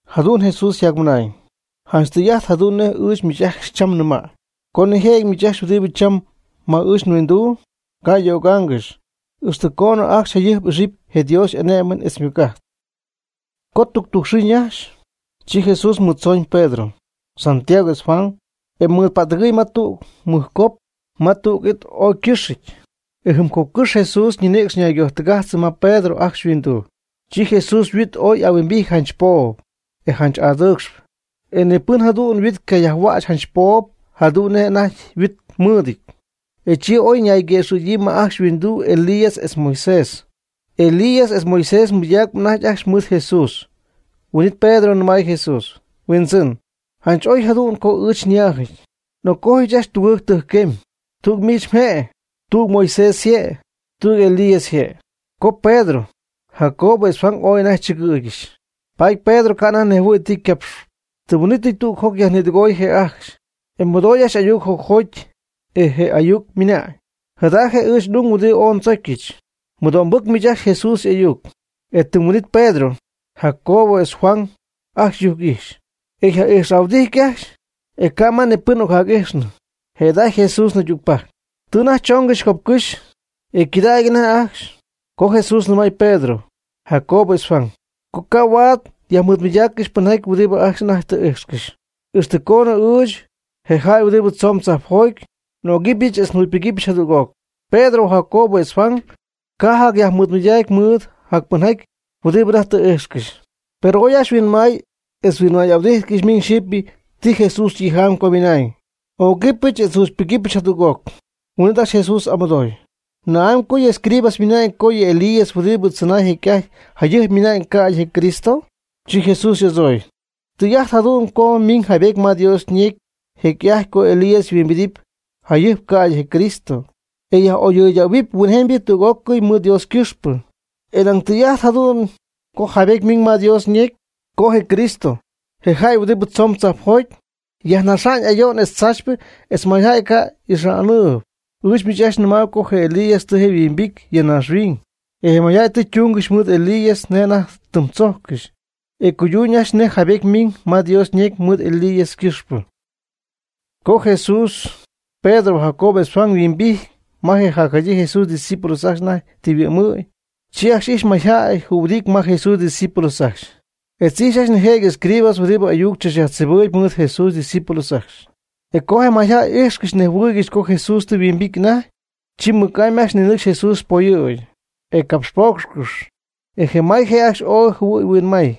Jadu'n Jesús yjacmɨnañ: ―Janch tɨy'ajt jadu'n nej ɨɨch miich ajcxy cham nɨmäy, co nijëjɨty miich ajcxy huɨdibɨ cham ma ɨɨch nhuinduu, ca' m'ögaangɨxy, ixtɨ coonɨ ajcxy jayɨjp m'ixɨpy je Dios y'ané'mɨn etz ymɨc'ajt. Co tuctujc xɨɨ naxy, chi Jesús mɨɨd tzooñ Pedro, Santiago etz Juan, e mɨɨdpa'ttɨgɨɨy ma tüg mɨjcop ma tüg it ooy ycɨ́xɨty. E jɨm copcɨ́xy Jesús ñinïcx naygojtɨgajtznɨ ma Pedro ajcxy yhuinduu. Chi Jesús yhuit oy y'ahuimbity janch poob, e janch adɨɨcxp. E ni pɨn jadu'n yhuit cayajhuäch janch poob jadu'n nej je' anajty yhuit mɨɨdɨty. E chi oy nayguëxɨ̈gyii ma ajcxy yhuindu Elías etz Moisés. Elías etz Moisés mɨydacp anajty ajcxy mɨɨd Jesús. Huin'it Pedro nɨmay Jesús: ―Huindzɨn, janch oy jadu'n co ɨɨch nyáajɨty. N'occojyɨch ajcxy tugɨɨg tɨjcquemy: tüg miich mje'; tüg Moisés yje'; etz tüg Elías yje'. Com Pedro, Jacobo etz Juan ooy anajty chɨgɨɨygɨxy, paady Pedro ca' anajty nejhuɨ̈y ti ycapxyp. Tɨm huin'ítɨy tüg joc yajnïdɨgoy je' ajcxy, e mɨdooy ajcxy ayuc jocjoty, e je ayuc ymɨnañ: ―Jada je' ɨɨch n'ung, huɨdibɨ ooy ndzocyɨch. Mɨdo'mbɨc miich ajcxy Jesús y'ayuc. E tɨm huin'ítɨy Pedro, Jacobo etz Juan ajcxy yujc'ijxy, e yja'ijxhuɨdijty ajcxy, e ca' ni pɨn ma ocjac'ijxnɨ, jëda'ajty Jesús naydügpajc. Tɨ anajty choongɨxy copcɨ́xy, e cɨdacp anajty ajcxy, co Jesús nɨmay Pedro, Jacobo etz Juan, co ca' huaad yajmɨɨdmɨydaaccɨxy pɨnjaty huɨdibɨ ajcxy anajty tɨ íjxcɨxy, ixtɨ coonɨ ɨɨch, je jäy huɨdibɨ tzoon tzajpjoty, n'ögɨbɨch etz njugypɨgɨpyɨch jadüg'oc. Pedro, Jacobo, etz Juan ca' yjacmɨydägy mɨɨd jacpɨnjaty huɨdibɨ anajty tɨ íjxcɨxy. Per ooy ajcxy huinmay etz naymɨɨdmɨydáacɨgɨxy miñ xyɨpy ti Jesús ytijamy co ymɨnañ: “N'ögɨbɨch etz njugypɨgɨpyɨch jadüg'oc.” Huin'it ajcxy Jesús y'amɨdooy: ―¿Na'amy co yɨ escribas ymɨna'ñ co yɨ Elías huɨdibɨ chɨnay jecy'ajty jayɨjp miina'ñ ca'ydɨ je Cristo? Chi Jesús y'adzooy: ―Tɨy'ajt jadu'n co miñ jaybety ma Dios ñecy jecy'ajty co Elías yhuimbidɨpy jacjayɨjp ca'ydɨ je Cristo, e yaj'oyɨydähuɨpy huinjemybɨ tüg'ócɨy mɨɨd Dios ycɨxpɨ. E nañ tɨy'ajt jadu'n co jaybety ymiiñ ma Dios ñecy co je Cristo, je jäy huɨdib tzoon tzajpjoty, yajnaxa'ñ ayo'n etz tzaachypɨ etz mayjäy ca' y'ixa'nɨɨby. Ɨɨch miich ajcxy nɨmaayb co je Elías tɨ je' yhuimbity ya naaxhuiñ, e je mayjäy tɨ túngɨxy mɨɨd Elías nej anajty tɨm tzójcɨxy. E cuyduñ ajcxy nej jaybety miiñ ma Dios ñecy mɨɨd Elías ycɨ́xpɨ. Co Jesús, Pedro, Jacobo etz Juan yhuimbity ma je jacjadyii Jesús ydiscípulos ajcxy anajty tɨ yhuɨ'mɨ̈y, chi ajcxy ijxy mayjäy jühuɨdity ma Jesús ydiscípulos ajcxy. Etz ijxy ajcxy nijëjɨty escribas huɨdibɨ ayuc tzachyajtzibɨɨyb mɨɨd Jesús ydiscípulos ajcxy. E co je mayjäy íjxcɨxy nejhuɨɨygɨxy co Jesús tɨ yhuimbity anajty, chi mɨc'amy ajcxy ninɨcxy Jesús poyɨ̈gy, e capxpoocxcɨxy, e may je' ajcxy ooy jɨhuɨy huinmay.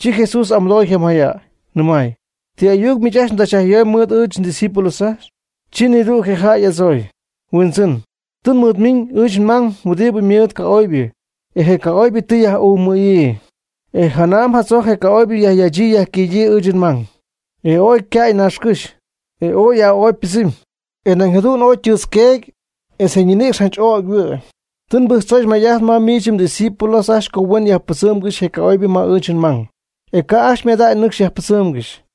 Chi Jesús y'amɨdooy je mayjäy, nɨmay: ―¿Ti ayuc miich ajcxy mdzachyajyomyb mɨɨd ɨɨch ndiscípulos ajcxy? Chi nidüg je jäy ajcxy y'adzooy: ―Huindzɨn, tɨ nmɨɨdmiiñ ɨɨch nmang huɨdibɨ ymɨɨd ca'oybɨ, e je ca'oybɨ tɨ yaj'umɨ̈yii. E janam jadzojc je ca'oybɨ yajyachyii yajquïdyii ɨɨch nmang, e oy cäy naaxcɨ́xy, e ooy y'aa'opy ypɨdzɨmy, e nañ jadu'n oy ytɨɨtz queety etz ñinïcx janch ögy yhuɨ'my. Tɨ nbɨjctzoyɨch may'ajt mɨɨd miich mdiscípulos ajcxy co huen yajpɨdzɨmgɨxy je ca'oybɨ ma ɨɨch nmang, e ca' ajcxy ymadacy nɨcxy yajpɨdzɨmgɨxy.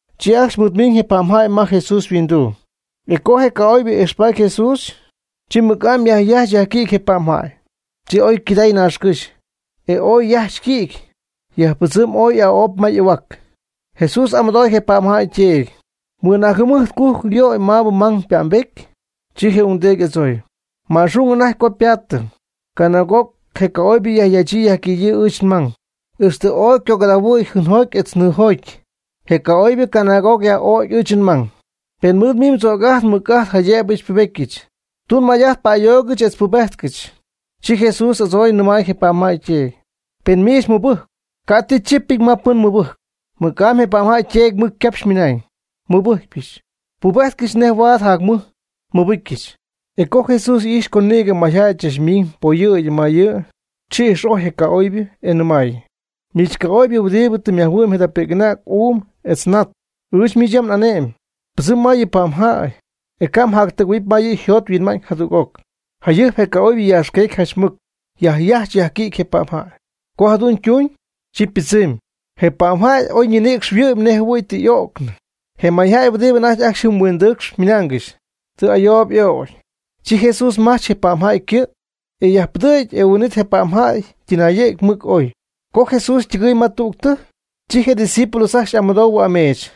Chi ajcxy mɨɨdmiñ je pa'mjäy ma Jesús yhuinduu. E co je ca'oybɨ ijxpaady Jesús, chi mɨc'amy yajyajch yajquïdy je pa'mjäy, e chi oy cɨday naaxcɨ́xy, e ooy yajch yquïdy, yajpɨdzɨmy ooy y'aa'opy ma y'ahuac. Jesús y'amɨdooy je pa'mjäy yteedy: ―¿Mɨnaag jɨmɨjt cujc yöy maabɨ mmang ypa'mbety? Chi je ungdeedy y'adzooy: ―Ma'xung anajty co pa'mbedyii. Canaag'oc je ca'oybɨ yajyachyii yajquïdyii ɨɨch nmang, ixtɨ tɨ oy ycogɨdahuɨ̈y jɨɨnjoty etz nɨɨjoty. Je ca'oybɨ canaag'oc jayaj'ögy ɨɨch nmang. Pen miich mɨɨd tzöc'ajt mɨc'ajt jaydëb xypubedɨpyɨch, tun may'ajt pa'ayoogɨch etz pubejtcɨch. Chi Jesús y'adzooy nɨmay je pa'mjäy yteedy: ―Pen miich mɨbɨjcpɨ, ca' ti chípɨty ma pɨn mɨbɨjcp. Mɨc'amy je pa'mjäy yteedy mɨc ycapxy ymɨnañ: ―Nmɨbɨjcyɨch, pubéjtcɨch nej huaad jacmɨj nmɨbɨcyɨch. E co Jesús ijxy co nïgɨ mayjäy chach ymiiñ poyɨ̈gy ma yɨ', chi ix'ojy je ca'oybɨ, e ymɨnañ: ―Miich ca'oybɨ huɨdib tɨ yajhuɨ'my jada pi'c'anäg uum etz nat, ɨɨch miich yam n'ane'myb: “Pɨdzɨm ma yɨ pa'mjäy, e ca' mjactɨgɨ̈huɨpy ma yɨ' yjot yhuinma'ñ jadüg'oc.” Jayɨjp je ca'oybɨ yaaxqueecy janch mɨc, yajyajch yajquïdy je pa'mjäy. Co jadu'n tuñ, chi ypɨdzɨmy. Je pa'mjäy oy ñinïcx yhuɨ'my nej jɨhuɨ̈y tɨ y'o'cnɨ. Je mayjäy huɨdibɨ anajty ajcxy jɨm huindɨcxp ymɨnaangɨxy: ―Tɨ ayoob y'ögy. Chi Jesús majtz je pa'mjäy ycɨ', e yajpɨdɨ̈gy e huin'it je pa'mjäy ytɨnayɨ̈gy mɨc oy. Co Jesús ytɨgɨɨy ma tüg tɨjc, chi je' ydiscípulos ajcxy y'amɨdou ameech,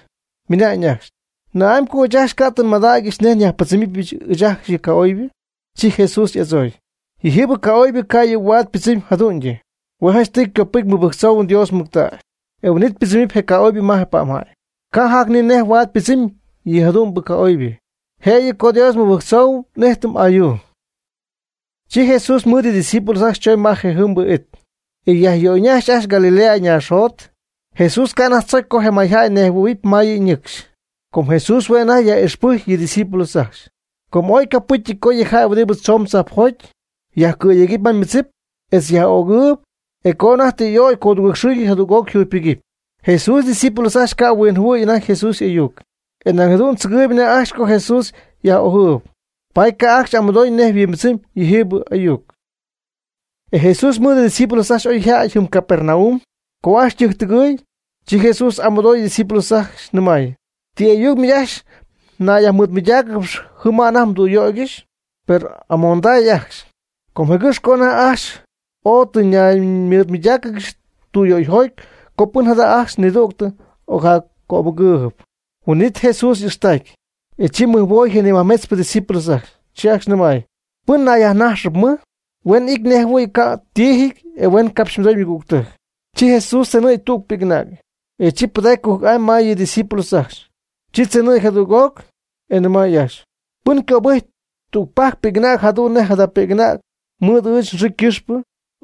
minañ ajcxy: ―¿Na'amy co ɨɨch ajcxy ca' tɨ nmadägyɨch nej nyajpɨdzɨmɨp ɨɨch ajcxy yɨ ca'oybɨ? Chi Jesús y'adzooy: ―Yɨjiibɨ ca'oybɨ ca' yɨ' huaad ypɨdzɨmy jadu'ñyɨ. Hue' janchtɨy copɨcy mɨbɨjctzou Dios mɨctägy, e huin'it ypɨdzɨmɨpy je ca'oybɨ ma je pa'mjäy. Ca' jac ni nej huaad ypɨdzɨmy yɨ jadu'mbɨ ca'oybɨ, jëyɨ co Dios nmɨbɨjctzoohuɨm n'íjtɨm ayuu. Chi Jesús mɨɨd yɨ' ydiscípulos ajcxy choñ ma je jɨmbɨ it, e yajyöyñajxtay ajcxy Galilea naaxjot. Jesús ca' anajty tzocy co je mayjäy ñejhuɨ̈huɨɨyb ma yɨ' ñɨcxy. Com Jesús hue' anajty yaj'ixpɨcy yɨ' ydiscípulos ajcxy, co ooy ycopɨ́cyɨty co yɨ jäy huɨdibɨ tzoon tzajpjoty, yajcɨ̈yegɨpy ma yɨ ymɨdzip, etz yaj'ögɨɨyb, e co anajty tɨ y'ögy codugɨɨg xɨɨ jadüg'oc yjugypɨgɨpy. Jesús ydiscípulos ajcxy ca' huinjɨhuɨ̈y anajty Jesús y'ayuc, e nañ jadu'n tzɨgɨɨyb anajty ajcxy co Jesús yaj'ójɨp, paady ca' ajcxy amɨdoy nej huimbɨdzɨmy yɨjiibɨ ayuc. E Jesús mɨɨd ydiscípulos ajcxy oyjäty jɨm Capernaum. Co ajcxy ytɨjctɨgɨɨy, chi Jesús yaj'amɨdoy ydiscípulos ajcxy, nɨmay: ―¿Ti ayuc miich ajcxy naymɨɨdmɨydáacɨgɨxy jɨm ma anajty mdüyöygɨxy? Per amonday ajcxy, com jëgɨxpɨ co anajty ajcxy ooy tɨ ñaymɨɨdmɨydáacɨgɨxy tüyöyjoty co pɨn jada' ajcxy nidügtɨ ocjaccopɨ́cyɨp. Huin'it Jesús y'ixtacy, e chi mɨjhuoy je nimajmetzpɨ ydiscípulos ajcxy, chi ajcxy nɨmay: ―Pɨn nayyajnaxaanɨp mɨj, huen ity nej jɨhuɨ̈y ca' ytiijɨty e huen capxmɨdoy ymɨgügtɨjc. Chi Jesús tzenɨ̈gy tüg pi'c'anäg, e chi pɨdacy cujc'amy ma yɨ' ydiscípulos ajcxy. Chi tzenɨ̈gy jadüg'oc, e nɨmay ajcxy: ―Pɨn cöbɨjc tügpajc pi'c'anäg jadu'n nej jada pi'c'anäg mɨɨd ɨɨch nxɨɨ ycɨxpɨ,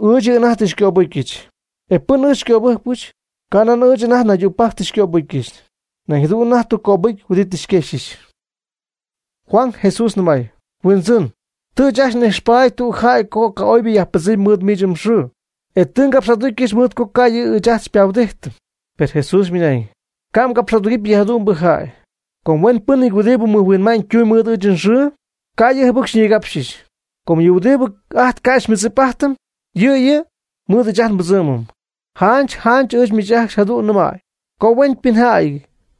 ɨɨch yɨ' anajty tɨ xycöbɨcyɨch, e pɨn ɨɨch xycöbɨjcpɨch, ca nan ɨɨch anajty naydügpajc tɨ xycöbɨjcyɨch, nañ jadu'n anajty tɨ cöbɨcy huɨdi tɨ xyquejxɨch. Juan Jesús nɨmay: ―Huindzɨn, tɨ ɨɨch ajcxy n'ijxpaady tüg jäy co ca'oybɨ yajpɨdzɨmy mɨɨd miich mxɨɨ, e tɨ ngapx'aducyɨch mɨɨd co ca' yɨ' ɨɨch ajt xypahuɨdíjtɨm. Per Jesús ymɨnañ: ―Ca' mgapx'adugɨpy yɨ jadu'mbɨ jäy, com huenpɨ́nɨty huɨdibɨ mɨjhuinma'ñ tumb mɨɨd ɨɨch nxɨɨ, ca' yɨ' jɨbɨc xyñigapxɨch. Com yɨ huɨdibɨ ajt ca' xymɨdzip'ájtɨm, yɨ' yɨ' mɨɨd ɨɨch ajt nbɨdzɨ́mɨm. Janch janch ɨɨch miich ajcxy jadu'n nɨmäy co huenpɨnjäy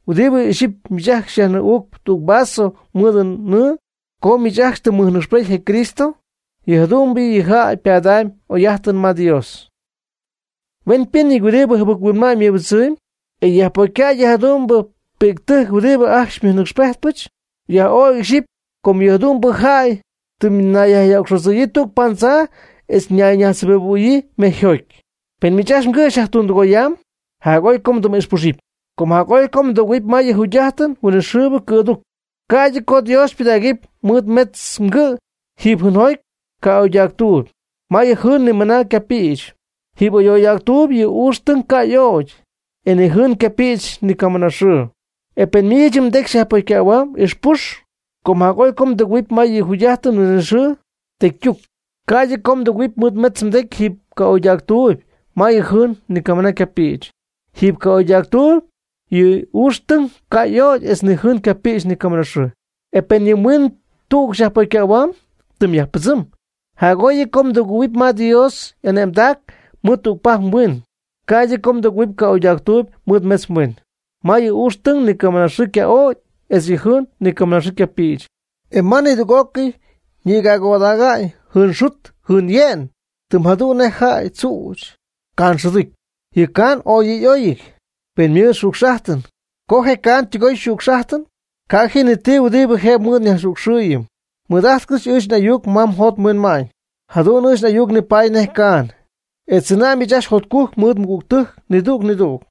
huɨdibɨ ixyipy miich ajcxy xyajnɨɨ'uucp tüg vaso nɨɨ mɨɨd co miich ajcxy tɨ mmɨjnɨcxpety je Cristo, yɨ jadu'mbɨ jäy ypadamy yɨ' y'oy'ájtɨn ma Dios. Huenpɨ́nɨty huɨdibɨ jɨbɨc-huinma'ñ mɨbɨdzɨmb, e yajpocycäy yɨ jadu'mbɨ pi'ctɨjc huɨdibɨ ajcxy xymɨjnɨcxpejtpɨch, jac'oy ixyipy co yɨ jadu'mbɨ jäy ytɨmyñayyajyöcxodzɨ̈yii tüg paandzaa etz ñayñajtzjɨbibɨ̈huɨɨyb mejyjoty. Pen miich mgɨ' xyajtundɨgoyamb jac'oy co mdɨm'ixpuxɨpy, com jac'oy co mdɨgɨ̈huɨpy ma yɨ jugy'ájtɨn huinɨxɨɨbɨ cɨ̈duc, ca'ydɨ co Dios xypɨdägɨp mɨɨd metz mgɨ' jiiby jɨɨnjoty ca'oydactuuby, ma yɨ jɨɨn ni camɨna ycapïch. Jiiby ca'oydactuuby yɨ ucxytɨng ca' y'ögy etz ni jɨɨn ycapïch nicamɨnaaxɨɨ. E pen miich yɨ mdecy xyajpocycähuamb, ixpux, com jac'oy co mdɨgɨ̈huɨp ma yɨ jugy'ájtɨn huinɨxɨɨbɨ tecytuc ca'ydɨ co mdɨgɨ̈huɨp mɨɨd metz mdecy jiiby ca'oydactuuyb, ma yɨ jɨɨn ni camɨna ycapïch. Jiiby ca'oydactuuby yɨ ucxytɨng ca' y'ögy etz ni jɨɨn ycapïch ni camɨnaxɨɨ. E pen yɨ mhuiin tüg xyajpocycähuamb, tɨm yajpɨdzɨm, jac'oy yɨ' co mdɨgɨ̈huɨp ma yɨ Dios y'ane'mdac mɨɨd tügpajc mhuiin, ca'ydɨ co mdɨgɨ̈huɨp ca'oydactuuby mɨɨd metz mhuiin. Ma yɨ ucxytɨng ni camɨnaxɨɨ yca'ögy etz yɨ jɨɨn ni camɨnaxɨɨ ycapïch, e ma nidüg'ócɨy ñi'cägooda'ñ jɨɨn xut jɨɨn ye'n tɨm jadu'n nej jäy tzüch caan xɨducy. Yɨ caan ooy yɨ' y'óyɨty, pen ymɨɨd xücx'ájtɨn. Co je caan ytɨgoy yxücx'ájtɨn, ca' ji ni ti huɨdibɨ jëb mɨɨd nyajxücxɨɨyɨm. Mɨɨd'ájtcɨx ɨɨch n'ayuc ma mjot mhuinma'ñ, jadu'n ɨɨch n'ayuc nipaady nej caan, e tzɨna' miich ajcxy jotcujc mɨɨd mmɨgügtɨjc nidüg nidüg.